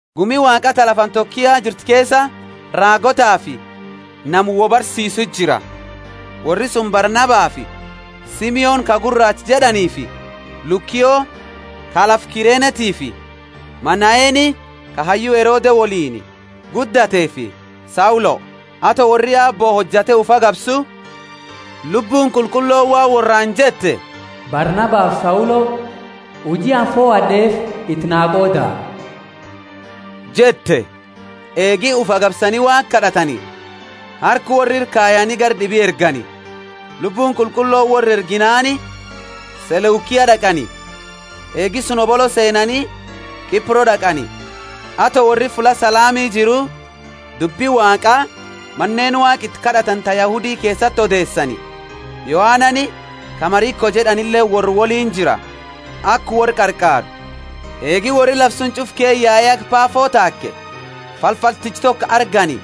Gumi Waaqa ta lafa Antiokia jirtu keesa, raagootafi nama wo barsiisu jira. Worri suni Barnabafi Simoni ka Guraacha jed'aniifi Lukio ka lafa Kirenetiifi Manaeni ka hayyu Herode woliini guddateefi Saulo. Ato worri Aabbo hojate ufi agabsu, Lubbuuni Qulqullooni waan worraani jette, Barnabafi Saulo huji anini fohad'eefi iti na qooda jette. Eegi ufi agabsani Waaqa kad'atani, harka worra ira kayani gara d'ibi ergani. Lubbuuni Qulqullooni worra erginaani Seleukia d'aqani. Eegi suni hobolo seennaani Kipro d'aqani. Ato worri fulla Salami jiru dubbi Waaqaa maneeni Waaqa iti kad'atani ta Yahudi keesati odeesani Yohanani ka Mariko jed'anileeni worra woliini jira aka worra qarqaaru. Eegi worri lafa suni ch'ufa ke yae haga Pafo taake, falfalticha toko argani,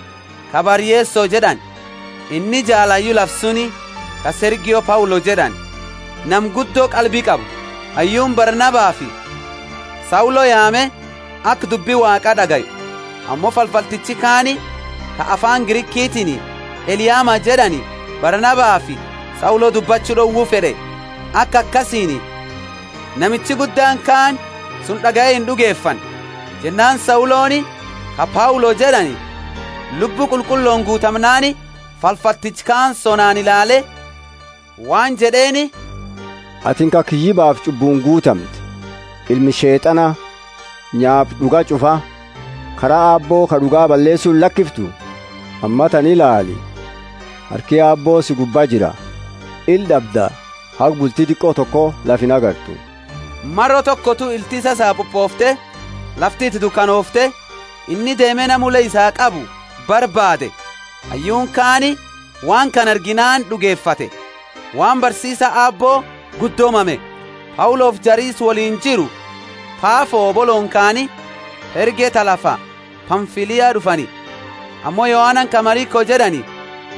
ka Bar-Yeso jed'ani. Inni jaala hayyu lafa suni, ka Sergio Paulo jed'ani, nama guddo qalbi qabu. Hayyuuni Barnabafi Saulo yaame, aka dubbi Waaqa d'agayu. Ammo falfaltichi kaani ka afaani Grikitiini Eliama jed'ani Barnabafi Saulo dubbachu d'owu fed'e, aka akasiini namichi guddaani kaani suni d'agaye ind'ugefanne. Jennaani Sauloni, ka Paulo jed'ani, Lubbu Qulqullooni guutamnaani falfalticha kana sonaani ilaale waan jed'eeni, Atini ka kiyyibafi ch'ubbuuni guutamte, ilma Sheet'ana, nyaapa d'uga ch'ufaa, karaa Aabbo ka d'uga balleesu illakiftu? Ammatana ilaali, harki Aabbo si gubbaa jira; ila d'abda, haga bulti diqo toko lafa ingartu. Maro tokotu ilti isaa sapupoofte, lafti iti dukanoofte, inni deeme nama ule isaa qabu barbaade. Hayyuuni kaani waan kana arginaani d'ugefate, waan barsiisa Aabbo guddo mame. Paulofi jari isa woliini jiru Pafo hobolooni kaani, Perge ta lafa Pamfilia d'ufani; ammo Yohanani ka Mariko jed'ani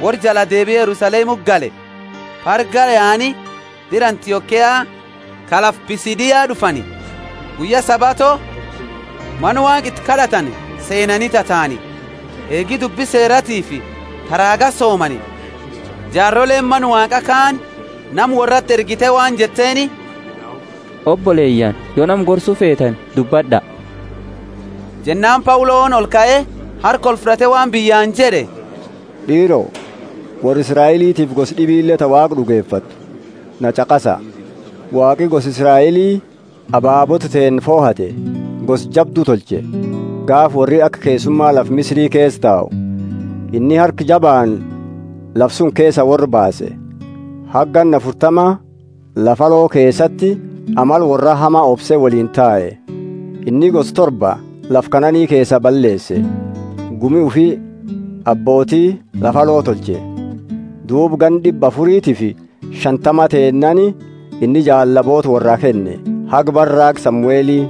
worra jala deebie Yerusalemuti gale. Pergaa yaani dira Antiokia ka lafa Pisidia d'ufani; guyya Sabato mana Waaqa iti kad'atani seenani tataani. Eegi dubbi Seeratiifi ta raaga soomani, jaaroleeni Mana Waaqaa kaani nama worrati ergite waan jetteeni, Oboleyaani, yo nama gorsu feetani, dubbad'a. Jennaani Pauloni olkae, harka olfud'ate waan biyyaani jed'e. D'iiro, worra Israelitiifi gosa d'ibile ta Waaqa d'ugefattu, na ch'aqasa! Waaqi gosa Israeli ababoota teenna fohate gosa jabdu tolche, gaafa worri aka keesuma lafa Misiri keesa tau. Inni harka jabaani lafa suni keesa worra baase, haga ganna afurtama lafa aloo keesati amala worraa hama obse woliini tae. Inni gosa torba lafa Kanaani keesaa balleese, gumi ufi abbooti lafaa tolche. Sam 3.20Duuba ganna d'ibba afuritifi shantama teennaani, inni jaallaboota worraa kenne, haga bara raaga Samueli.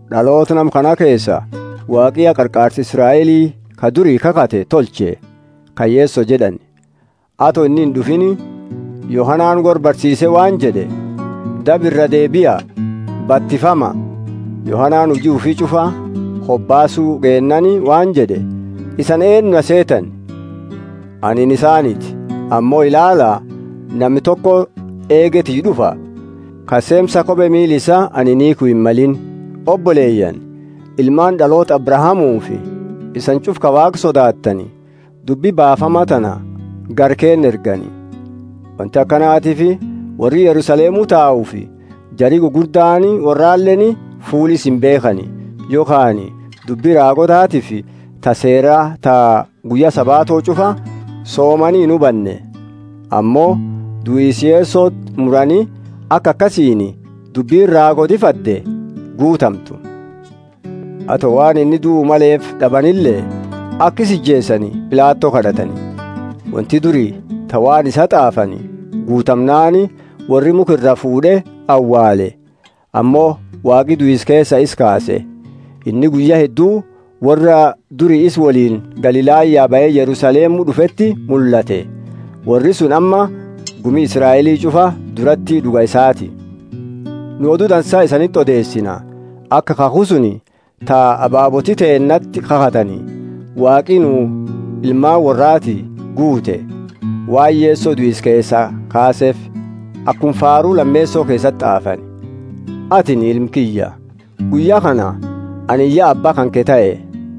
D'aloota nama kana keesa, Waaqi ya Qarqaarsa Israeli, ka duri kakhate, tolche, ka Yeso jed'ani. Ato inni ind'ufiini, Yohanani worra barsiise waan jed'e, Daba iraa deebia, batifama. Yohanani huji ufi ch'ufa hobaasu geennaani waan jed'e, Isani eennu na seetani? Anini isaaniti, ammo ilaala, nami toko eegi tiyya d'ufa, ka seemsa kope miila isaa anini hiikhu himmalini. Oboleyaani, ilmaani d'aloota Abrahamufi isani ch'ufa ka Waaqa sodaattani, dubbi baafama tana gara keenna ergani. Wonti akanatiifi worri Yerusalemu taufi jari gugurdaani worraleeni fuula isa imbeekhani yokhaani dubbi raagootatiifi ta Seera ta guyya Sabato ch'ufa soomani inhubanne. Ammo duisa Yesoti murani aka akasiini dubbini raagooti fadde guutamtu. Ato waan inni duu maleefi d'abanile, aka isa ijeesani Pilato kad'atani. Wonti duri, ta waan isaa t'aafani, guutamnaani, worri mukha iraa fuud'e awaale. Ammo Waaqi duisa keesa isa kaase. Inni guyya heddu worra duri isa woliini Galilaya bahe Yerusalemu d'ufeti mullate. Worri suni amma gumi Israeli ch'ufa durati d'uga isaati. Nu Odu Dansa isaniti odeesina, aka kakhu suni ta ababooti teennati kakhatani, Waaqi nuu ilmaani worraati guute, waan Yeso duisa keesaa kaaseefi. Akuma Faaru lameeso keesati t'aafani, Atini ilma kiyya, guyya kana anini ya Abba kanke tahe.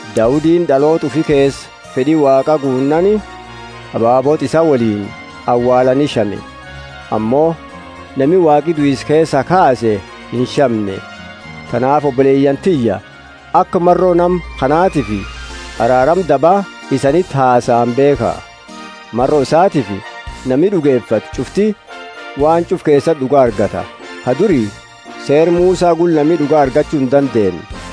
Daudini d'aloota ufi keesa fed'i Waaqa guunnaani, ababoota isaa woliini awaalani shame. Ammo nami Waaqi duisa keesaa kaase inshamne. Tanaafi oboleyaani tiyya, aka maro nama kanatifi araarama daba isaniti hasaani beekha. Maro isatiifi nami d'ugefatu ch'ufti waan ch'ufa keesati d'uga argata, ka duri Seera Musa gula nami d'uga argachu indandeenne.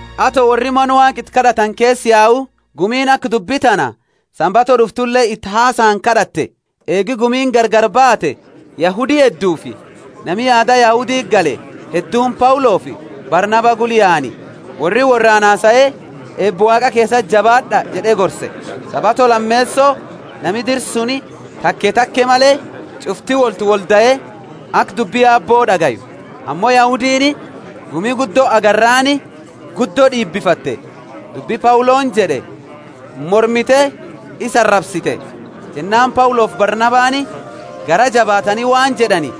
Ato worri mana Waaqa iti kad'atani keesaa yau, gumiini aka dubbi tana Sabato d'uftule iti hasaani kad'atte. Eegi gumiini gargari baate Yahudi heddufi nami aada Yahuditi gale hedduuni Paulofi Barnaba gula yaani. Worri worraani hasae, Eeba Waaqa keesati jabaad'a jed'e gorse. Sabato lameeso, nami dira suni, take take male, ch'ufti woltiwoldae aka dubbi Aabbo d'agayu. Ammo Yahudiini gumi guddo agarraani guddo d'iibifatte, dubbi Pauloni jed'e mormite isa arabsite. Jennaani Paulofi Barnabani garaa jabaatani waan jed'ani,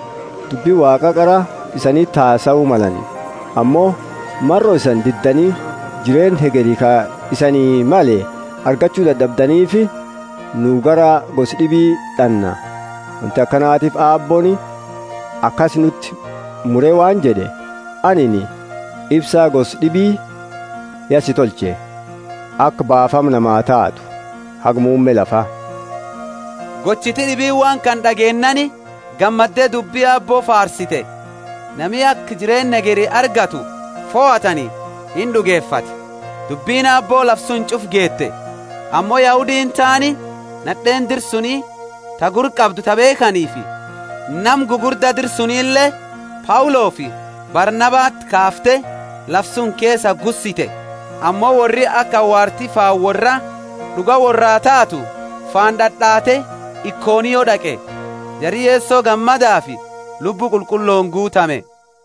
Dubbi Waaqa qara isaniti hasau malani. Ammo maro isani diddani jireenna hegeri ka isanii male argachu dad'abdanifi nu gara gosa d'ibii d'anna. Wonti akanatiifi Aabbooni akasi nuti mure waan jed'e, Anini ifsa gosa d'ibi ya si tolche, aka baafama namaa taatu, haga muumme lafa. Gochiti d'ibiini waan kana d'ageennaani gammadde dubbi Aabbo faarsite; nami aka jireenna hegeri argatu fohatani ind'ugefate. Dubbini Aabbo lafa suni ch'ufa geete. Ammo Yahudiini taani nad'eeni dira suni ta gurra qabdu ta beekhanifi, nama gugurda dira sunilee, Paulofi Barnabati kaafte lafa suni keesa gussite. Ammo worri aka awaarti faana worraa d'uga worraa taatu faana d'ad'ate Ikonio d'aqe. Jari Yeso gammadafi Lubbu Qulqullooni guutame.